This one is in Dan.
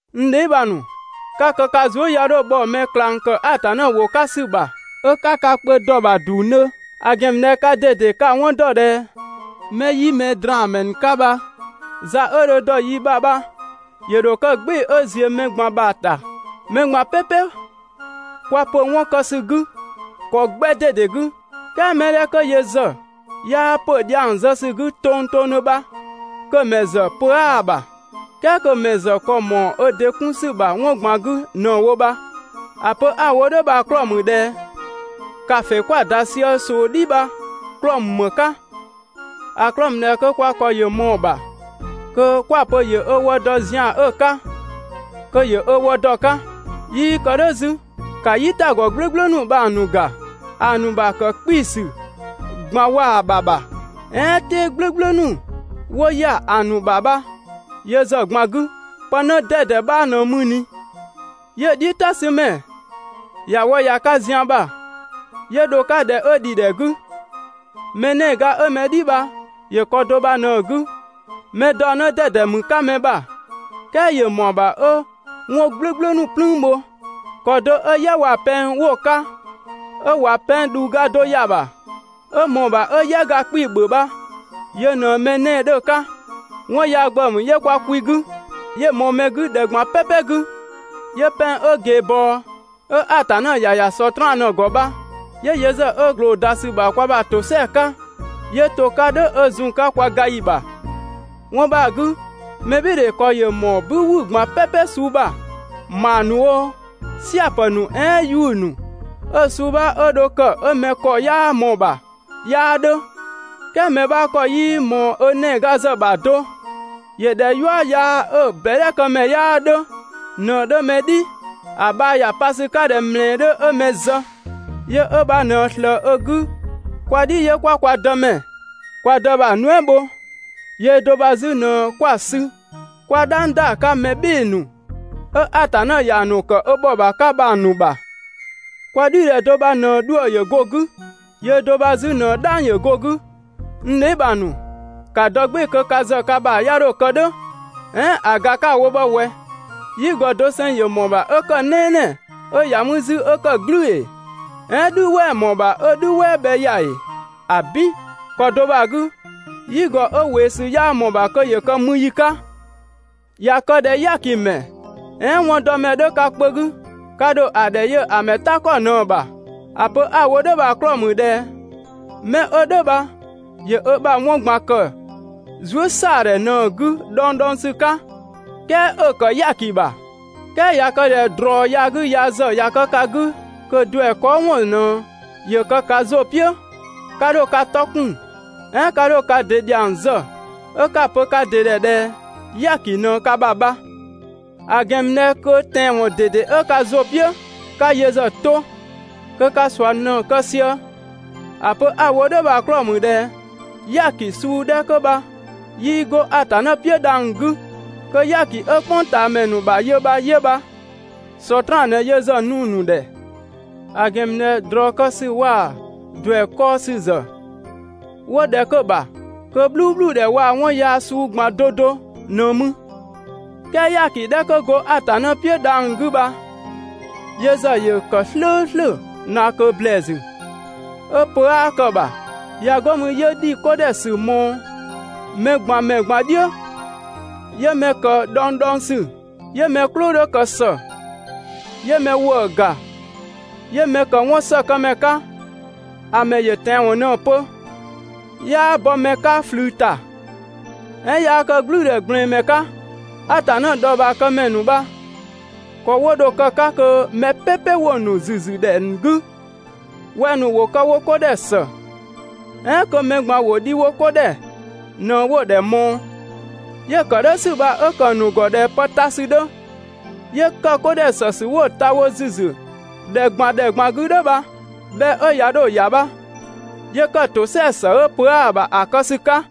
N dheebhang ‑nu, 'ka kë ka zuë" 'ya 'dho bhɔ mɛ ꞊klang ‑kë Atanna ‑wʋ 'ka ‑sü ‑bha 'ö 'ka ka kpö dɔ‑ ‑bha ‑dungdhö; ‑a ‑gɛn ‑mü ꞊dhɛ kaa ꞊dede ka‑ 'wɔn ‑dɔ ꞊dhɛ 'mɛ 'yi mɛdraanmɛ ‑nu 'ka bha, za 'ö dho‑ dɔ yi ‑bha bha ‑yö ‑dho kë "gbɩɩ‑ 'ö ‑ziö mɛ ꞊gban ‑bha ‑ta. Mɛ ꞊gban "pɛpɛ kwa ‑pö 'wɔn kë ‑sü 'gü ‑kɔ 'gbɛ ꞊dede 'gü, "kɛɛ mɛ 'dhɛ 'kö yö ‑zë 'yaa ‑pö dhiang zë ‑sü 'gü tongtongdhö bha kö‑ ‑mɛ ‑zë pö 'aa‑ ‑bha, "kɛɛ kö‑ ‑mɛ ‑zë ‑kɔ ‑mɔɔ ö ‑dɩ 'kun ‑sü ‑bha 'wɔn ꞊gban 'gü ꞊në‑ wo bha. ‑A pö 'a‑ wo "dhʋ̈ bha‑ 'klɔɔ‑ ‑mü ꞊dhɛ ‑kafe 'kwa‑ ‑da sië ꞊soo "dhi bha‑ 'klɔɔ‑ ‑mü ‑më 'ka? ‑A 'klɔɔ‑ ‑mü ꞊dhɛ kö kwa ‑kɔ ‑yö ꞊mɔɔ‑ ‑bha kö 'kwa‑ pö ‑yö ö wë dɔ zian 'ö‑ 'ka, kö ‑yö ö wë dɔ‑ 'ka. 'Yii ‑kë "dhʋ̈ 'zü, ‑ka "yitagɔ "gblʋ̈gblʋ̈ ‑nu bha‑ ‑nu ‑ga. ‑A ‑nu ‑bha ‑kë 'kpii‑ ‑sü ꞊gban waa‑ ‑bha ‑bha, "ɛɛn "tɛɛ "gblʋ̈gblʋ̈ ‑nu 'wo ‑ya ‑a ‑nu ‑bha bha yö ‑zë ꞊gban 'gü, pë 'në 'dɛdɛ 'bha ꞊në mü ꞊ni 'yö‑ "dhiʋ̈ "ta 'sü ‑mɛ ‑ya wë ‑ya 'ka zian ‑bha, 'yö dho‑ 'ka ‑dhɛ 'ö ‑dhi ‑dhɛ 'gü. Mɛ 'nɛɛga 'ö mɛ "dhi bha ‑yö ‑kɔ do bha ꞊në‑ 'gü. Mɛ daɔ 'në 'dɛdɛ ‑mü 'ka mɛ ‑bha, "kɛɛ ‑yö ‑mɔɔ ‑bha 'ö 'wɔn "gblʋ̈gblʋ̈ ‑nu "plüün bho. ‑Kɔ do 'ö "yɛ waa‑ pɛng 'wo‑ 'ka 'ö ꞊wa pɛng ꞊dhuuga do ‑ya ‑bha, 'ö ꞊mɔɔ‑ ‑bha 'ö "yɛga 'kpii‑ ‑bhö bha, yö ꞊në mɛ 'nɛɛ‑ 'dhö‑ 'ka. 'Wɔn yaa ‑gbëë ‑mü 'yö kwa kwi 'gü, 'yö‑ ꞊mɔɔ mɛ ‑wü 'gü ‑dhɛ ꞊gban "pɛpɛ 'gü, 'yö pɛng 'ö ꞊geebɔɔ, 'ö Atanna ‑ya ‑ya Sɔtraan ꞊në‑ ‑gɔ bha, 'yö yö ‑zë 'ö ꞊gloo‑ ‑da ‑sü ‑bha kwa ‑bha ‑tosɛa 'ka 'yö to‑ 'ka "dhʋ̈ 'ö zun‑ 'ka kwa ga ‑yi ‑bha. 'Wɔn bha‑ 'gü, mɛbhɩɩdhe ‑kɔ ‑yö ‑mɔɔ "bü ‑wü ꞊gban "pɛpɛ suu ‑bha, ‑maa ‑nu oo, "sia‑ ‑pë ‑nu "ɛɛn 'yuʋ̈‑ ‑nu, 'ö‑ suu 'bha 'ö dho kë 'ö mɛ ‑kɔ 'yaa ꞊mɔɔ‑ ‑bha 'yaa 'dhö, "kɛɛ mɛ 'bha ‑kɔ 'yii ꞊mɔɔ ö 'nɛɛga ‑zë ‑bha do, ‑yö ꞊dhɛ "yua yaa 'ö‑ ꞊bɛdhɛkëmɛ 'yaa 'dhö ꞊në‑ 'dhö mɛ "dhi. ‑A bhaa ‑ya pa ‑sü 'ka ꞊dhɛ ꞊mlɛɛ 'dhö 'ö mɛ zë. Yö 'ö bha ꞊në ꞊slëë‑ 'gü kwa "dhi 'yö 'kwa kwa Dëmɛ, kwa Dë bha‑ nuɛ" bho, yöö do bha 'zü ꞊në 'kwa‑ sü 'kwa "dhang ‑da 'ka mɛ "bhɩɩ‑ ‑nu 'ö Atanna ‑ya ‑nu ‑kë ö ‑bhɔbha 'ka bha‑ ‑nu ‑bha. Kwa "dhi ‑dhɛ do bha ꞊në 'dhuë‑ ‑yö go‑ 'gü, yöö do bha 'zü ꞊në "dhang‑ go‑ 'gü. N dheebhang ‑nu, ‑ka dɔ "gbɩɩ‑ kö ka ‑bha ‑zë 'ya 'dho kë "dhʋ̈. "Ɛɛn ‑a ‑ga 'ka‑ wo bha ꞊wɛ, "yigɔ doseng ‑yö ‑mɔɔ ‑bha 'ö ‑kë "nɛɛnɛɛ 'ö ‑ya mü 'zü 'ö ‑kë "glüü ‑ee? "Ɛɛn "dhü "wɛɛ‑ ‑mɔɔ ‑bha 'ö "dhü "wɛɛ bhɛ ‑ya ‑ee? ‑Abin! ‑Kɔ do bha‑ 'gü, "yigɔ 'ö ꞊weesü 'yaa ꞊mɔɔ‑ ‑bha kö ‑yö kë mü ‑yi 'ka. ꞊Ya kë ꞊dhɛ "yaakimɛ, "ɛɛn 'wɔndɔmɛ 'dhö ka kpö 'gü, ka ‑dho ‑a ‑dhɛ yö‑ mɛ "ta ‑kɔ ꞊në‑ ‑bha. ‑A pö 'a‑ wo "dhʋ̈ bha‑ 'klɔɔ‑ ‑mü ꞊dhɛ 'mɛ 'ö "dhʋ̈ bha ‑yö ö ‑bha 'wɔn ꞊gban ‑kë zuësɛadhɛ ꞊në‑ 'gü dhɔngdhɔngsü 'ka, "kɛɛ 'ö‑ ‑kë "yaaki ‑bha. "Kɛɛ ꞊ya kë ꞊dhɛ ꞊drɔ yaa 'gü yaa ‑zë ꞊ya kë ka 'gü kö ‑duɛ kɔɔ‑ ‑wɔn ꞊në ‑yö kë ka ‑zʋ "piʋ̈, 'ka 'dho ka 'tɔ 'kun, "ɛɛn 'ka 'dho ka ‑dɩ ‑dhiang zë ('ö 'ka‑ pö ka ‑dɩ ‑dhɛ ꞊dhɛ "yaaki ꞊në ka ‑bha bha). ‑A ‑gɛn ‑mü ꞊dhɛ kö tɛanwɔn ꞊dede 'ö ka ‑zʋ "piʋ̈ 'ka yö ‑zë 'to, kö ka ꞊sua ꞊në‑ kë sië. ‑A pö 'a‑ wo "dhʋ̈ bha‑ 'klɔɔ‑ ‑mü ꞊dhɛ "yaaki suu 'dhɛ 'kö bha 'yii 'go Atanna "piʋ̈ dhang‑ 'gü. Kö "yaaki 'ö "kpʋngtaamɛ ‑nu ‑bha yö bha 'yö bha. Sɔtraan ꞊në yö ‑zë nu‑ ‑nu ‑dhɛ. ‑A ‑gɛn ‑mü ꞊dhɛ ꞊drɔ kë ‑sü waa‑ ‑duɛ kɔɔ‑ ‑sü ‑zë 'wo ‑dhɛ 'kö‑ ‑bha, kö "bhluubhludhɛ waa‑ 'wɔn yaa suu ꞊gban 'do 'do ꞊në mü. "Kɛɛ "yaaki 'dhɛ 'kö go Atanna "piʋ̈ dhang‑ 'gü bha yö ‑zë ‑yö ‑kë "slʋ̈ʋ̈slʋ̈ ꞊naa ꞊kö ‑blɛɛsü, 'ö pö 'aa kë‑ ‑bha, ꞊ya 'go mü 'yö ‑dhi 'ko ‑dhɛ ‑sü ꞊mɔɔ mɛ ꞊gban ‑mɛ ꞊gban "dhiʋ̈, 'yö mɛ ‑kë dhɔngdhɔngsü, 'yö mɛ "klʋ 'dhö ‑kë ‑së, 'yö mɛ ‑wëë ‑ga, 'yö mɛ ‑kë 'wɔnsëkëmɛ 'ka, ‑a ‑mɛ ‑yö tɛanwɔn ꞊në‑ pö, 'yaa bɔ mɛ 'ka ꞊flü ‑ta, "ɛɛn 'yaa kë "gblʋ̈ʋ̈dhɛ ꞊gblɛɛn mɛ 'ka. Atanna dhɔɔbhaa këmɛ ‑nu bha ‑kɔ 'wo dho‑ kë‑ 'ka kö mɛ "pɛpɛ 'wo‑ ‑nu ‑züzü ‑dhɛ ‑nu 'gü wɛng‑ ‑nu ‑wo kë wo 'ko ‑dhɛ ‑së, "ɛɛn kö mɛ ꞊gban ‑wo dhi wo 'ko ‑dhɛ ꞊në 'wo‑ ‑dhɛ ꞊mɔɔ, 'yö‑ ‑kë "dhʋ̈ ‑sü bha 'ö ‑kë ‑nu ‑gɔ ꞊dhɛ pë ta ‑sü 'dhö, 'yö ‑kë 'ko ‑dhɛ ‑së ‑sü 'wo‑ ta wo ‑züzü ‑dhɛ ꞊gban ‑dhɛ ꞊gban 'gü "dhʋ̈ bha, bhɛ 'ö ꞊ya 'dho‑ ‑ya bha, 'yö ‑kë ‑tosɛa ‑së 'ö pö 'aa‑ ‑bha ‑a kë ‑sü 'ka.